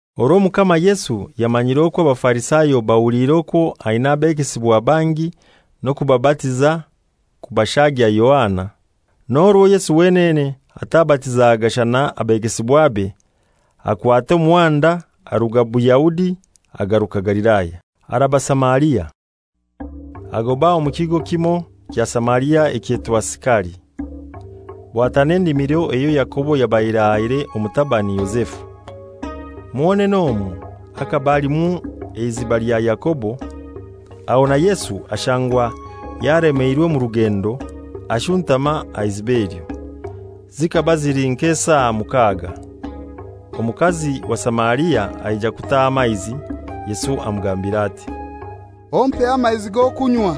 Orwo Omukama Yesu yamanyire okwo Abafarisayo bahuliire okwo aina abegesibwa bangi n'okubabatiza kubashagya Yohana, (n'orwo Yesu wenene atabatizaga, shana abegesibwabe), akwata omuhanda aruga Buyahudi agaruka Galilaya, araba Samaria. Agoba omu kigo kimoi kya Samaria ekyetwa Sikari, bwatana endimiro eyo Yakobo yabaire ahaire omutabani Yozefu. Mwonene omwo bhakaba halimu eiziba lya Yakobo, aho na Yesu ashangwa yalemeirwe omu rugendo ashuntama aha iziba elyo. Zikaba zili nk'esaa mukaaga. Omukazi wa Samaria aija kutaaha amaizi. Yesu amugambira ati, «Ompeho amaizi g'okunywa.»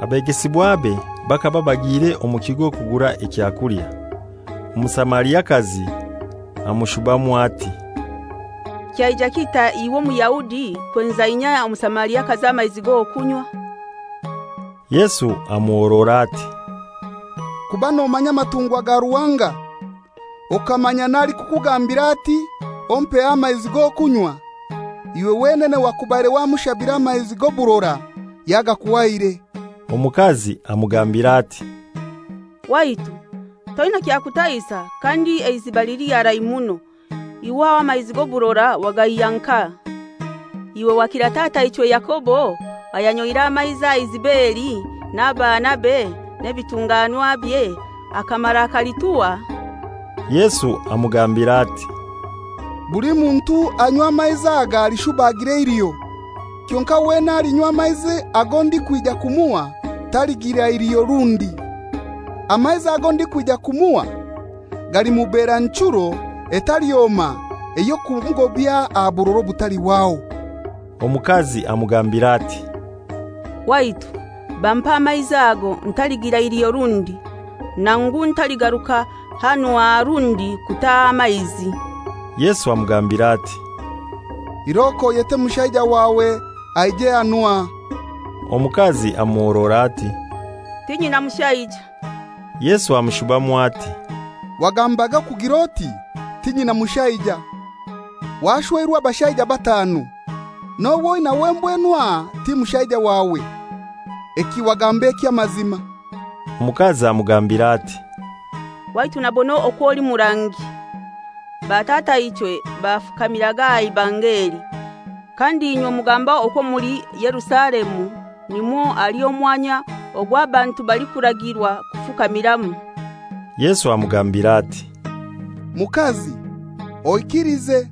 Abegesibwabe bakaba bagiire omu kigo kugura ekyakulya. Omusamariakazi amushubamu ati, «Kyaija kitai iwe Omuyahudi kwenza inye Omusamariakazi amaizi g'okunywa?» Yesu amuhorora ati, «Kuba nomanya amatungwa ga Ruhanga, okamanya n'alikukugambira ati, ‹Ompeho amaizi g'okunywa,› iwe wenene wakubaire wamushabire amaizi g'oburora yagakuhaire.» Omukazi amugambira ati, «Waitu, toinai kyakutahisa, kandi eiziba lili harai muno; iwe aho amaizi g'oburora wagaihya nkahai? Iwe wakira tataichwe Yakobo ayanyoire amaizi aha iziba eli, n'abaanabe, n'ebitunganwabye, akamara akalituha?» Yesu amugambira ati, «Buli muntu anywa amaizi aga alishuba agire eiliho, kyonkai wena alinywa amaizi ago ndikwija kumuha, taligira iliho rundi. Amaizi ago ndikwija kumuha galimubera nchuro etalyoma ey'okumugobya aha burora obutalihwaho.» Omukazi amugambira ati, «Waitu, bampe amaizi ago, ntaligira iliho rundi, nangu ntaligaruka hanu aha rundi kutaaha amaizi.» Yesu amugambira ati, «Iroko oyete mushaija wawe aije hanu aha.» Omukazi amuhorora ati, «Tinyina mushaija.» Yesu amushubamu ati, «Wagambage okugir'oti, ‹Tinyina mushaija.› Washweirwe abashaija batanu, n'ow'oinaiwe mbwenu aha ti mushaija wawe. Eki wagamba eky'amazima.» Omukazi amugambira ati, «Waitu nabona okw'oli murangi. Batataichwe bafukamiraga aha ibanga eli; kandi inywe mugamba okwo omuli Yerusalemu nimwo hali omwanya ogw'abantu balikuragirwa kufukamiramu.» Yesu amugambira ati, «Mukazi, oikilize,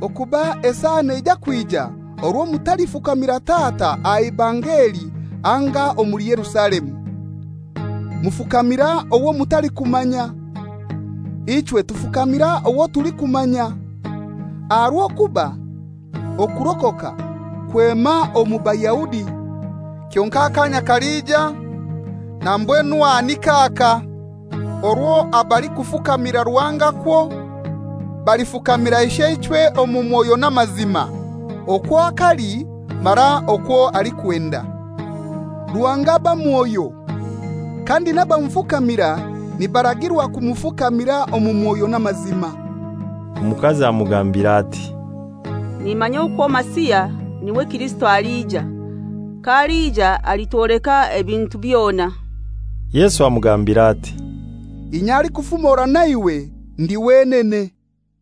okuba esaa neija kwija orwo mutalifukamira Tata aha ibanga eli anga omuli Yerusalemu. Mufukamira owo mutalikumanya. Ichwe tufukamira owo tulikumanya, aha rw'okuba okurokoka kwema omu Bayahudi. Kyonkai akaanya kalija, na mbwenu aha nik'aka, orwo abalikufukamira Ruhanga kwo balifukamira Isheichwe omu mwoyo n'amazima okwo akali mara okwo alikwenda.» Ruhanga aba Mwoyo, kandi n'abamufukamira nibaragirwa kumufukamira omu Mwoyo n'amazima. Omukazi amugambira ati, «Nimanya okwo Masiha, n'iwe Kirisito, alija. K'alija alitwoleka ebintu byona.» Yesu amugambira ati, «Inye alikufumora na iwe ndi wenene.»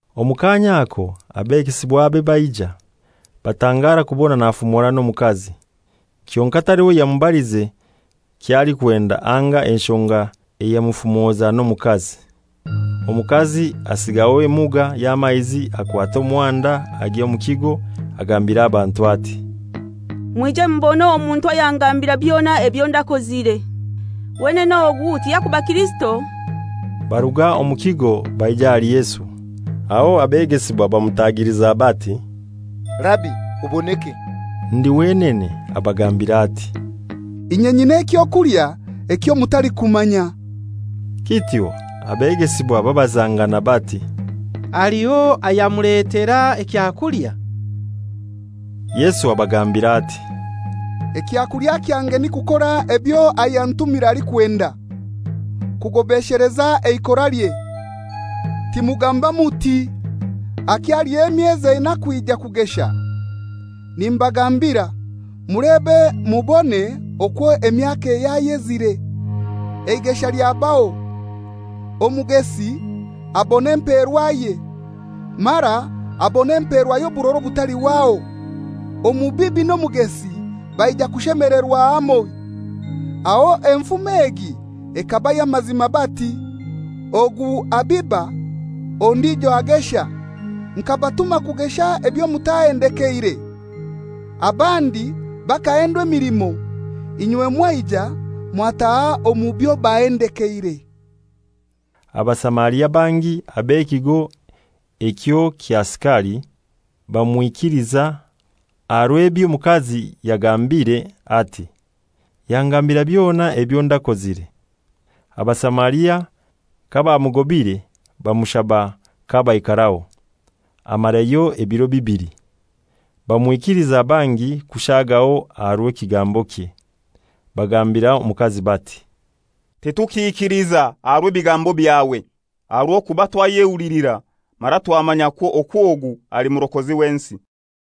Omu kaanya ako abegesibwabe baija. Batangara kubona nafumora n'omukazi, kyonkai taliho yamubalize ky'alikwenda anga enshonga eyamufumoza n'omukazi. Omukazi asigaho emuga y'amaizi akwata omuhanda agya omu kigo, agambira abantu ati, «Mwije mubone omuntu ayangambira byona ebyo ndakozire. Wenene ogu tiyakuba Kirisito?» Baruga omu kigo baija ahali Yesu. Aho abegesibwa bamutagiliza bati, «Rabi, oboneke.» Ndi wenene abagambira ati, «Inye nyina eky'okulya ekyo mutalikumanya.» Kityo abegesibwa babazangana bati, «Haliho ayamuletera ekyakulya?» Yesu abagambira ati, «Ekyakulya kyange ni kukora ebyo ayantumire alikwenda, kugobesheleza eikoralye. Timugamba muti, ‹Hakyaliyo emyezi enai kwija kugesha?› Nimbagambira, mulebe mubone okwo emyaka yayezire, eigesha lyabaho. Omugesi abona emperwaye, mara abona empeerwa y'oburora obutalihwaho, omubibi n'omugesi baija bashemelerwa hamoi. Aho enfumo egi ekaba y'amazima bati, ‹Ogu abiba, ondijo agesha.› Nkabatuma kugesha ebyo mutahendekeire. Abandi bakahendwa emilimo, inywe mwaija mwataaha omu byobahendekeire.» Abasamaria bangi ab'ekigo ekyo kya Sikari bammikiliza aha rw'eby'omukazi yagambire ati,«Yangambira byona ebyo ndakozire.» Abasamaria kabamugobire bamushaba k'abaikaraho; amarayo ebiro bibili. Bamwikiliza bangi kushagaho aha rw'ekigambokye. Bagambira omukazi bati, «Titukiikiliza aha rwa bigambo byawe, aha rw'okuba twayehulilira, mara twamanyakwo okwo ogu ali murokozi w'ensi.»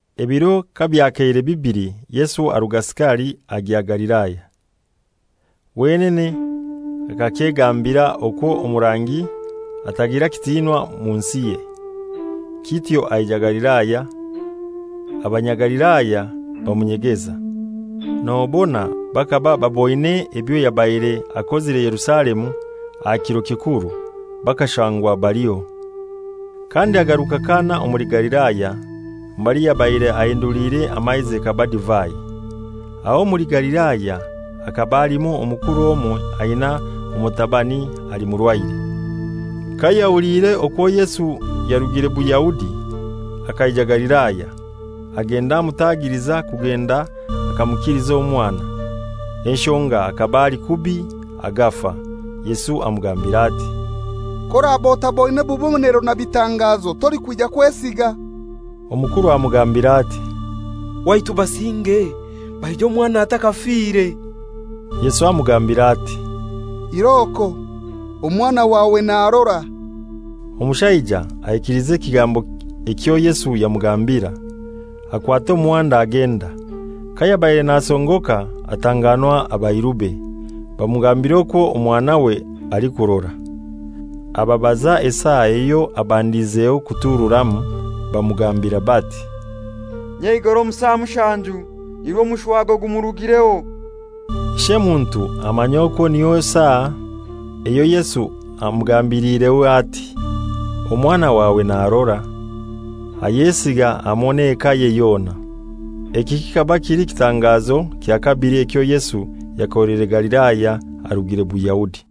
Ebiro kabyakeire bibili Yesu aruga Sikari agya Galilaya. Wenene akakyegambira okwo omurangi atagira kitinwa mu nsiye. Kityo aija Galilaya, Abanyagalilaya bamunyegeza, nobona bakaba baboine ebyo yabaire akozire Yerusalemu aha kiro kikuru, bakashangwa baliho. Kandi agaruka Kana omuli Galilaya, mbali yabaire ahinduliire amaizi ekaba divai. Aho omuli Galilaya bhakaba halimu omukuru omoi aina omutabani ali murwaire. Kayahuliire okwo Yesu yarugire Buyahudi akaija Galilaya, agenda amutagiliza kugenda akamukiliza omwana, enshonga hakaba ali kubi agafa. Yesu amugambira ati, «K'oraba otaboine bubonero na bitangazo timulikwija kwesiga.» Omukuru amugambira ati, «Waitu basinge baije omwana atakafire.» Yesu amugambira ati, «Iroko, omwana wawe narora.» Omushaija aikiliza ekigambo ekyo Yesu yamugambira, akwata omuhanda agenda. Kayabaire nasongoka atanganwa abairube, bamugambira okwo omwanawe alikurora. Ababaza esaa eyo yabandizaho kutururamu. Bamugambira bati, «Nyeigoro omu saa mushanju nirwo omushwago gumurugireho.» Ishemuntu amanya okwo niyo saa eyo Yesu amugambiliireho ati, «Omwana wawe narora;» ayesiga hamoi n'ekaye yona. Eki kikaba kili kitangazo kya kabili ekyo Yesu yakoleire Galilaya arugire Buyahudi.